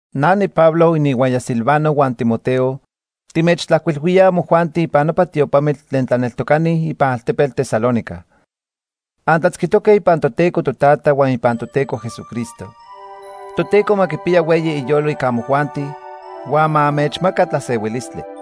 Na niPablo, ininhuaya Silvano huan Timoteo, timechtlajcuilhuíaj amojuanti ipan nopa tiopamitl tlen tlaneltocani ipan altepetl Tesalónica. Antlatzquitoque ipan Toteco Totata huan ipan Toteco Jesucristo. Toteco ma quipiya hueyi iyolo ica amojuanti huan ma anmechmaca tlasehuilistli.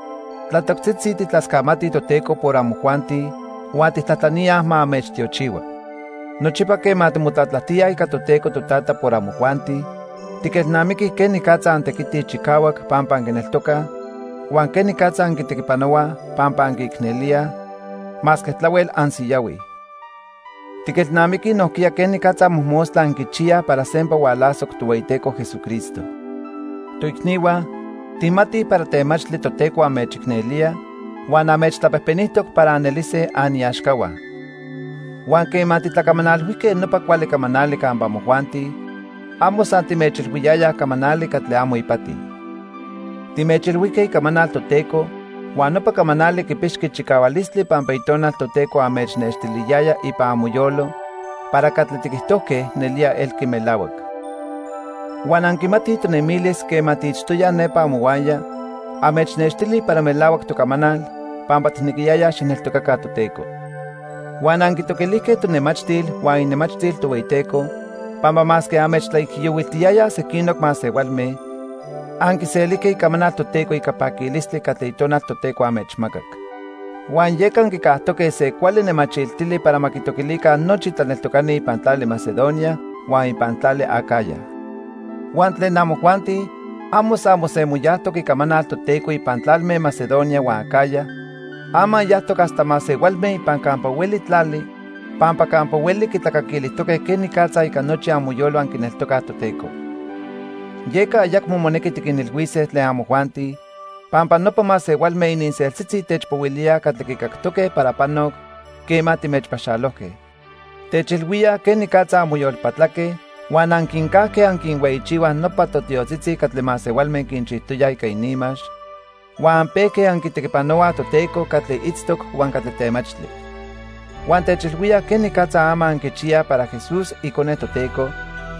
Tlatoctzitzi tijtlascamatij Toteco por amojuanti huan tijtlajtlaníaj ma anmechtiochihua. Nochipa quema timotlatlajtíaj ica Toteco Totata por amojuanti, tiquelnamiquij quenicatza antequitij chicahuac pampa anquineltocaj, huan quenicatza anquitequipanohuaj pampa anquiicnelíaj, masque tlahuel ansiyahuij. Tiquelnamiquij nojquiya quenicatza mojmostla anquichiyaj para sempa hualasoc Tohueyiteco Jesucristo. Toicnihua, tijmatij para temachtli Toteco anmechicnelía huan anmechtlapejpenijtoc para anelise aniaxcahua. Huan quema titlacamanalhuijque nopa cuali camanali campa amojuanti, amo san timechilhuiyayaj camanali catli amo ipati. Timechilhuijque icamanal Toteco huan nopa camanali quipixqui chicahualistli pampa Itonal Toteco anmechnextiliyaya ipan amoyolo para catli tiquijtojque nelía elqui melahuac. Huan anquimatij tonemilis quema tiitztoyaj nepa amohuaya anmechnextili para melahuac tocamanal pampa tijnequiyayaj xijneltocaca Toteco. Huan anquitoquilijque tonemachtil huan inemachtil Tohueyiteco, pampa masque anmechtlaijiyohuiltiyayaj sequinoc masehualme, anquiselijque icamanal Toteco ica paquilistli catli Itonal Toteco anmechmacac. Huan yeca anquicajtoque se cuali nemachiltili para ma quitoquilica nochi tlaneltocani ipan tlali Macedonia huan ipan tlali Acaya. Huan tlen amojuanti, amo san mosemoyajtoc icamanal Toteco ipan tlalme Macedonia huan Acaya, ama yajtoc hasta masehualme ipan campa hueli tlali, pampa campa hueli quitlacaquilijtoque quenicatza ica nochi amoyolo anquineltocaj Toteco. Yeca ayacmo monequi tiquinilhuise tlen amojuanti, pampa nopa masehualme ininseltzitzi techpohuilíaj catli quicactoque para panoc quema timechpaxalojque. Techilhuíaj quenicatza anmoyolpatlaque huan anquincajque anquinhueyichihuaj nopa totiotzitzi catli masehualme quinchijtoyaj ica ininmax, huan anpejque anquitequipanohuaj Toteco catli itztoc huan catli temachtli. Huan techilhuíaj quenicatza ama anquichiyaj para Jesús, icone Toteco,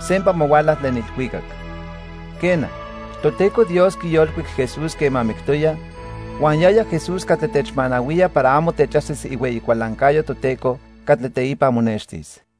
sempa ma huala tlen ilhuicac. Quena, Toteco Dios quiyolcuic Jesús quema mictoya, huan yaya Jesús catli techmanahuía para amo techajsis ihueyi cualancayo Toteco catli teipa monextis.